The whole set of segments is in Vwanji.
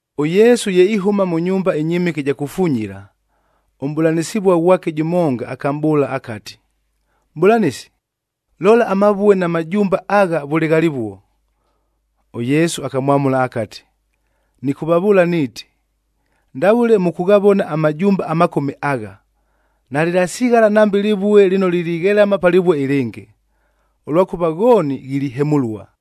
ɄYesu ye ihʉma mʉ nyumba ɨnyɨmɨke ɨja kufunyila, ʉmʼbʉlanɨsɨvua ghwake jʉmonga akamʼbʉʉla akati, “Mʼbʉlanɨsi, lola amavue na majumba agha vʉle ghalɨvuo!” ɄYesu akamwamʉla akati, “Nɨkʉvavʉʉla niiti, ndavʉle mʉkʉghavona amajumba amakome agha, nalɨlasighala nambe lɨvue lɨno lilighelama pa lɨvue ɨlɨngɨ, ʉlwakʉva ghooni ghilihemʉlua.”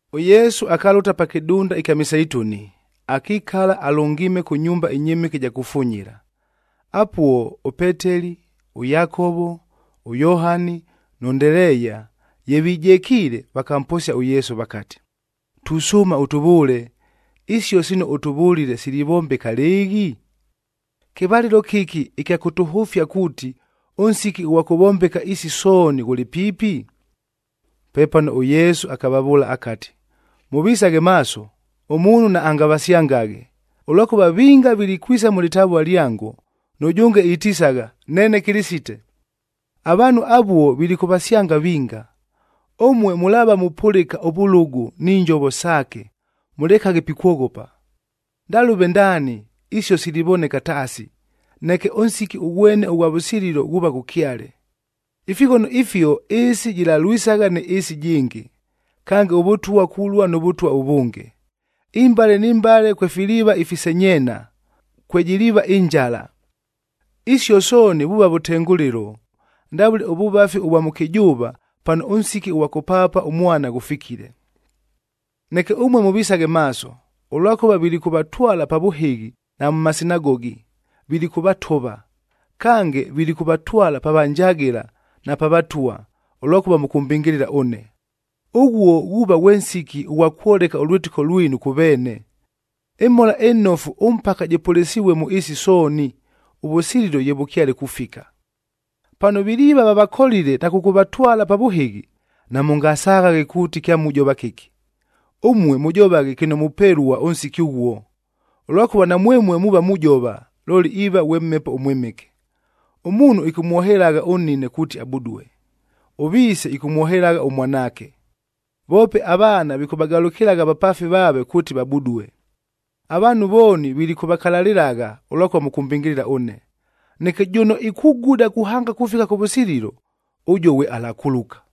ɄYesu akalʉta pa kɨdunda ɨkya Miseituni, akikala alʉngiime kʉ nyumba ɨnyɨmɨke ɨja kufunyila. Apuo ʉPeteli, ʉYakovo, ʉYohani nʉ Ndeleeya, ye vijekiile, vakamposia ʉYesu vakati, “Tusʉʉma ʉtʉvʉʉle, isio sino ʉtʉvʉlile silivombeka lɨɨghi? Kɨvalɨlo kɨki ɨkya kʉtʉhʉfia kuuti, ʉnsiki ʉghwa kʉvombeka isi sooni ghʉlɨ piipi?” Pepano ʉYesu akavavʉʉla akati, “Mʉvisaghe maaso, ʉmuunhu naangavasyangaghe, ʉlwakʉva vinga vilikwisa mʉ lɨtavua lyango, nʉjʉnge itisagha, ‘Neene Kɨlɨsite.’ Avaanhu avuo vilikʉvasyanga vinga. Ʉmue mʉlaava mupʉlɨka ʉvʉlʉgʉ ni njovo saake, mʉlekaghe pikwoghopa. Ndalʉve ndaani isio silivoneka taasi, neke ʉnsiki ʉghwene ʉghwa vʉsililo ghuuva ghʉkyale. Ifighono ifio ɨɨsi jɨlalwisagha nɨ ɨɨsi ɨjɨngɨ, kange ʉvʉtwa kulua nʉ vʉtwa ʉvʉnge. Imbale ni mbale kwefiliiva ifisenyeena, kwejiliiva ɨnjala. Isio sooni vuuva vʉtengʉlɨlo, ndavʉle ʉvʉvafi ʉvwa mʉkɨjʉʉva, pano ʉnsiki ʉghwa kʉpaapa ʉmwana ghʉfikile. “Neke ʉmue mʉvisaghe maaso, ʉlwakʉva vilikʉvatwala pa vʉhɨghi na mʉ masinagogi, vilikʉvatova. Kange, vilikʉvatwala pa vanjagɨla na pa vatwa, ʉlwakʉva mʉkʉmbɨngɨlɨla ʉne. Ʉghuo ghuuva ghwe nsiki ʉghwa kwoleka ʉlwɨtɨko lwinu kʉ veene. ƗMhola ɨNofu ʉmpaka jɨpʉlɨsɨvue mʉ ɨɨsi sooni, ʉvʉsililo ye vʉkyale kufika. “Pano viliiva vavakolile na kʉkʉvatwala pa vʉhɨghi, namʉngasaghaghe kuuti kyamujova kɨki, ʉmue mʉjovaghe kɨno mupelua ʉnsiki ʉghuo. Ʉlwakʉva namwemue muuva mujova, looli iiva ghwe Mhepo ʉMwɨmɨke. Ʉmuunhu ɨkʉmwohelagha ʉnnine kuuti abudue. Ʉviise ɨkʉmwohelagha ʉmwanaake, voope avaana vikʉvagalʉkɨlagha avapaafi vaave kuuti vabudue. Avaanhu vooni vilikʉvakalalɨlagha ʉlwakʉva mʉkʉmbɨngɨlɨla ʉne. Neke jʉno ikuguda kuhanga kufika kʉvʉsililo, ʉjuo ghwe alakuluka.”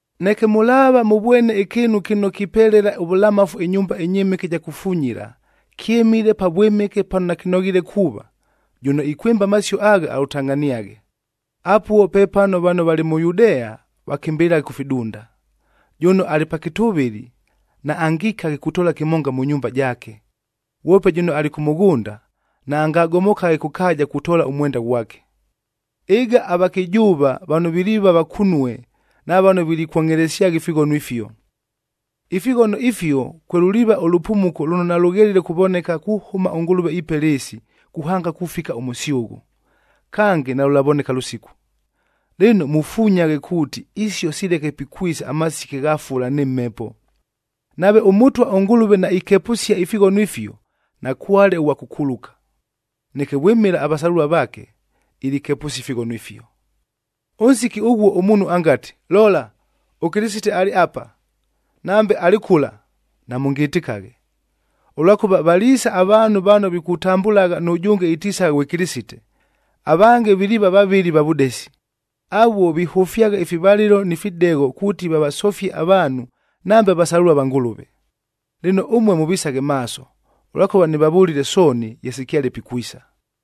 “Neke mʉlaava mʉvwene ɨkɨɨnu kɨno kipelela ʉvʉlamafu ɨnyumba ɨnyɨmɨke ɨja kufunyila,a kyɨmile Pavwɨmɨke pano nakɨnoghiile kuuva, jʉno ikwɨmba amasio agha alʉtangʼhaniaghe, apuo pepano vano valɨ mʉ Yudea vakɨmbɨlɨlaghe kʉ fidunda. Jʉno alɨ pa kɨtʉvɨlɨ,b naangikaghe kutoola kɨmonga mʉ nyumba jaake. Ghwope jʉno alɨ kʉ mʉghʉnda, naangagomokaghe kʉ kaaja kutoola ʉmwenda ghwake. Ɨga avakɨjʉʉva vano viliiva vakunue na vano vilikwongʼhelesyagha ifighono ifio! Ifighono ifio, kwelʉliiva ʉlʉpumuko lʉno nalʉghelile kuvoneka kuhʉma ʉNgʉlʉve ipela ɨɨsi, kuhanga kufika ʉmʉsyʉghʉ. Kange, nalʉlavoneka lʉsiku. Lɨno, mufunyaghe kuuti isio sileke pikwisa amasiki agha fula nɨ mhepo. Nave ʉMʉtwa ʉNgʉlʉve naikepʉsia ifighono ifio, nakwale ʉghwa kʉkuluka. Neke vwɨmɨla avasalʉlua vaake, ilikepʉsia ifighono ifio. “Ʉnsiki ʉghuo ʉmuunhu angati, ‘Lola! ɄKɨlɨsite alɨ apa,’ nambe, ‘Alɨ kʉla,’ namʉngɨtɨkaghe. Ʉlwakʉva valiisa avaanhu vano vikutambʉlagha nʉjʉnge itisagha ghwe Kɨlɨsite, avange viliiva vavɨli va vʉdesi. Avuo vihʉfyagha ifivalɨlo ni fidegho kuuti vavasofie avaanhu, nambe avasalʉlua va Ngʉlʉve. Lɨno, ʉmue mʉvisaghe maaso, ʉlwakʉva nɨvavʉlile sooni, ye sikyale pikwisa.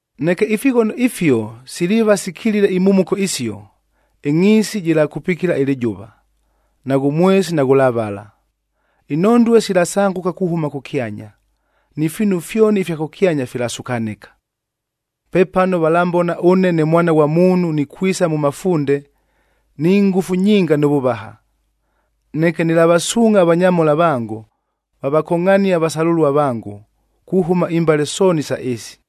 “Neke ifighono ifio siliiva sikilile imhumuko isio, ‘ɨngʼhiisi jɨlakupikila ɨlɨjʉva, naghʉ mwesi naghʉlavala. Inhondue silasangʉka kuhʉma kʉkyanya,’c ni fiinu fyoni ifya kʉkyanya filasukanɨka. “Pepano valambona ʉne ne Mwana ghwa Muunhu nikwisa mʉ mafunde ni ngʉfu nyinga nʉ vʉvaha. Neke nɨlavasuungʼha avanyamhola vango, vavakongʼhanie avasalʉlua vango, kuhʉma imbale sooni isa ɨɨsi.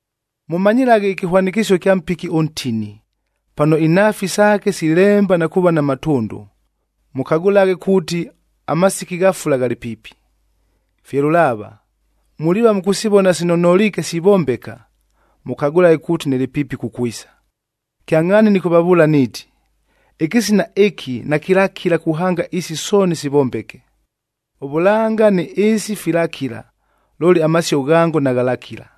“Mʉmanyɨlaghe ɨkɨhwanɨkɨsio ɨkya mpiki ʉntini. Pano inhaafi saake silemba na kuuva na matʉndʉ, mʉkagʉlaghe kuuti amasiki gha fula ghalɨ piipi. Fye lʉlaava, muliiva mʉkʉsivona sino noliike sivombeka, mʉkagʉlaghe kuuti nɨlɨ piipi kukwisa. Kyangʼhaani nɨkʉvavʉʉla niiti, ɨkɨsina ɨkɨ nakɨlakila kuhanga isi sooni sivombeke. Ʉvʉlanga nɨ ɨɨsi filakila, looli amasio ghango naghalakila.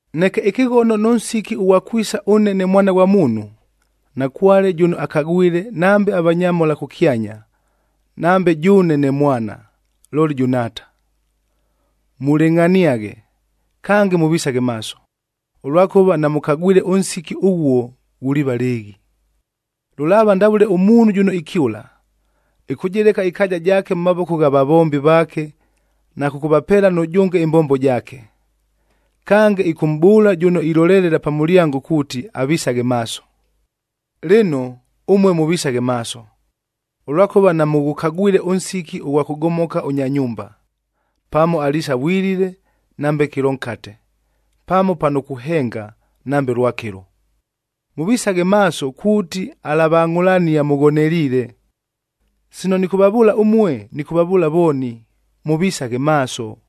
“Neke ɨkɨghono nʉ nsiki ʉghwa kwisa ʉne ne Mwana ghwa Muunhu, nakwale jʉno akagwile nambe avanyamhola kʉkyanya, nambe jʉʉne ne Mwana, looli jʉ Nhaata. Mulɨngʼhaniaghe, kange mʉvisaghe maaso,d ʉlwakʉva namʉkagwile ʉnsiki ʉghuo ghuliiva lɨɨghi. “Lʉlaava ndavʉle ʉmuunhu jʉno ikyʉla, ɨkʉjɨleka ɨkaaja jaake mʉ mavoko gha vavombi vaake na kʉkʉvapeela nʉjʉnge ɨmbombo jaake. Kange, ɨkʉmʼbʉʉla jʉno ilolelela pa mʉlyango kuuti avisaghe maaso. Lɨno, ʉmue mʉvisaghe maaso, ʉlwakʉva namʉghʉkagwile ʉnsiki ʉghwa kʉgomoka ʉnya nyumba, pamo aliisa vwilile nambe kɨlo nkate, pamo pano kuhenga nambe lwakɨlo. Mʉvisaghe maaso kuuti alavangʼhʉlania mʉghoneliile. Sino nɨkʉvavʉʉla ʉmue, nɨkʉvavʉʉla vooni, ‘Mʉvisaghe maaso!’”